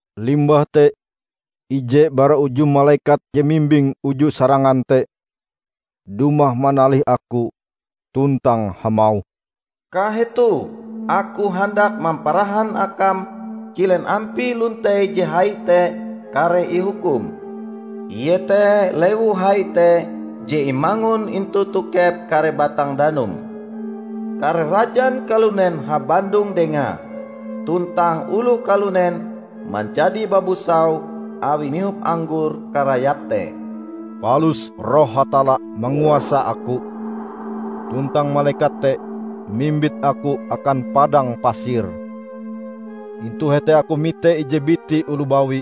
Limbah te ije bara uju malekat je mimbing uju sarangan te dumah manalih aku tuntang hamauh, "Kahetoh, aku handak mamparahan akam kilen ampie lontei je hai te kareh ihukum, iete lewu hai te je imangun intu tokep kare batang danum. Kare rajan kalunen habandong dengae, tuntang oloh kalunen manjadi babusau awi mihop anggor karayape te." Palus Roh Hatalla manguasa aku, tuntang malekat te mimbit aku akan padang pasir. Intu hete aku mite ije biti oloh bawi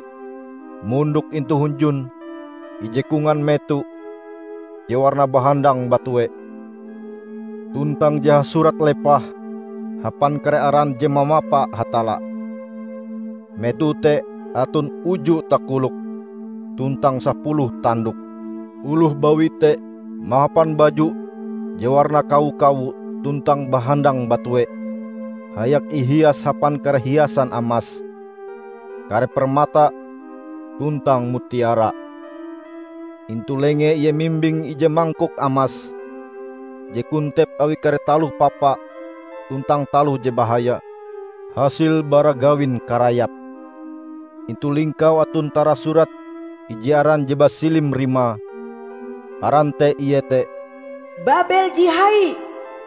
mondok intu hunjun ije kongan meto je warnae bahandang batue, tuntang je hasurat lepah hapan kare aran je mamapa Hatalla. Meto te aton uju takoloke tuntang sapuluh tandoke. Oloh bawi te mahapan baju je warnae kawo-kawo tuntang bahandang batue, hayak ihias hapan kare hiasan amas, kare permata, tuntang mutiara. Intu lengee ie mimbing ije mangkok amas je kontep awi kare taloh papa tuntang taloh je bahaya, hasil bara gawin karayape. Intu lingkaue aton tarasurat ije aran je basilim rimae. Aran te iete "Babel Je Hai,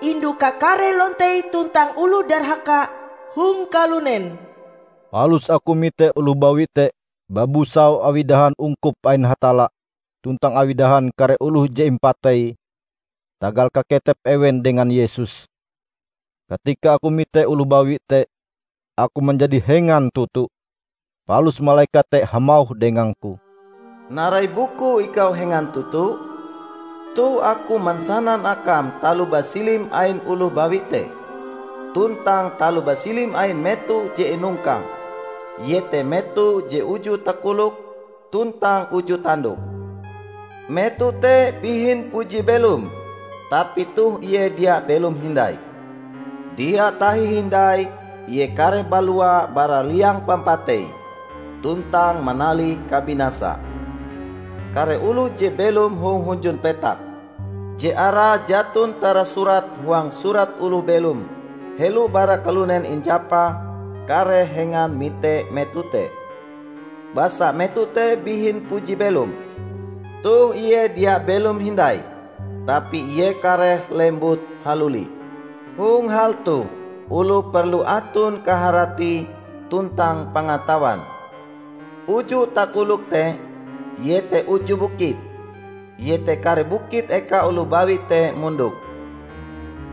indu kakare lontei tuntang oloh darhaka hong kalunen." Palus aku mite oloh bawi te babusau awi dahan ungkup ain Hatalla tuntang awi dahan kare oloh je impatei tagal kaketep ewen dengan Yesus. Katika aku mite oloh bawi te, aku manjadi hengan toto. Palus malekat te hamauh dengangku, "Narai bukue ikau hengan toto? Toh Aku mansanan akam taloh basilim ain oloh bawi te tuntang taloh basilim ain meto je inongkange, iete meto je uju takoloke tuntang uju tandoke. Meto te bihin puji belom, tapi toh ie dia belom hindai. Dia tahi hindai ie kareh balua bara liang pampatei tuntang manalih kabinasa. Kare oloh je belom hong hunjun petak, je arae jaton tarasurat huang Surat Oloh Belom helo bara kalunen injapa kareh hengan mite meto te. Basa meto te bihin puji belom. Toh ie dia belom hindai tapi ie kareh lembut haluli. Hong hal toh oloh perlu aton kaharati tuntang pangatawan. Uju takolok te iete uju bukit; iete kare bukit eka oloh bawi te mondok.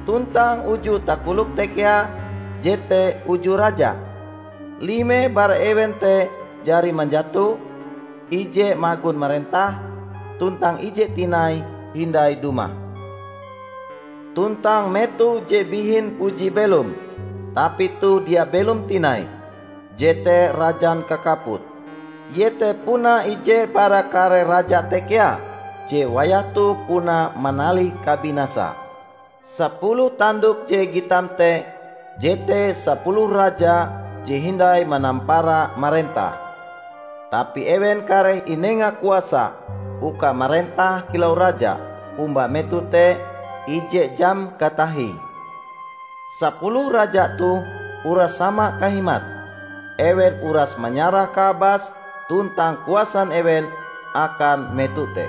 Tuntang uju takolok te kea jete uju raja: lime bara ewen te jari manjato, ije magon marentah, tuntang ije tinai hindai dumah. Tuntang meto je bihin puji belom, tapi toh dia belom tinai, jete rajan kakaput. Ie te puna ije bara kare raja te kea, je wayah toh puna manalih kabinasa. Sapuluh tandok je gitam te jete sapuluh raja je hindai manampara marentah. Tapi ewen kareh inenga kuasa uka marentah kilau raja omba meto te ije jam katahie. Sapuluh raja toh uras sama kahimate; ewen uras manyarah kaabas tuntang kuasan ewen akan meto te.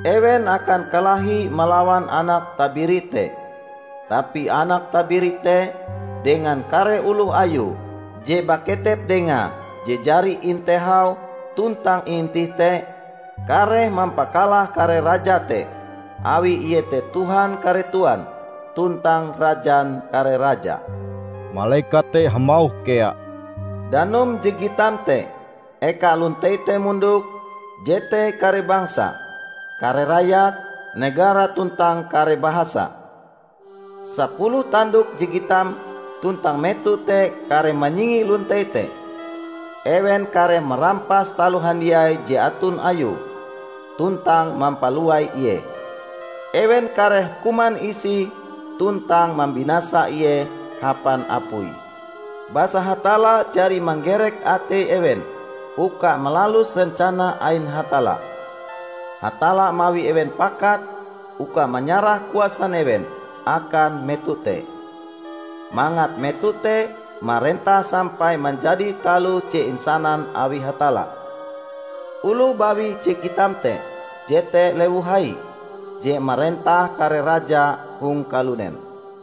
Ewen akan kalahi malawan Anak Tabiri te. Tapi Anak Tabiri te dengan kare oloh Ayue je baketep dengae je jari intehau tuntang iintih te, kareh mampakalah kare raja te, awi ie te Tuhan kare tuan, tuntang Rajan kare raja." Malekat te hamauh kea, "Danum je gitam te, eka lontei te mondok, jete kare bangsa, kare rayat, negara tuntang kare bahasa. Sapuluh tandok je gitam tuntang meto te kareh manyingi lontei te. Ewen kareh marampas taloh handiai je aton ayue, tuntang mampalowai ie. Ewen kareh kuman isie tuntang mambinasa ie hapan apui. Basa Hatalla jari manggerek atei ewen uka malalus rencana ain Hatalla. Hatalla mawi ewen pakat uka manyarah kuasan ewen akan meto te, mangat meto te marentah sampai manjadi taloh je insanan awi Hatalla. Oloh bawi je gitam te jete lewu hai, je marentah kare raja hong kalunen."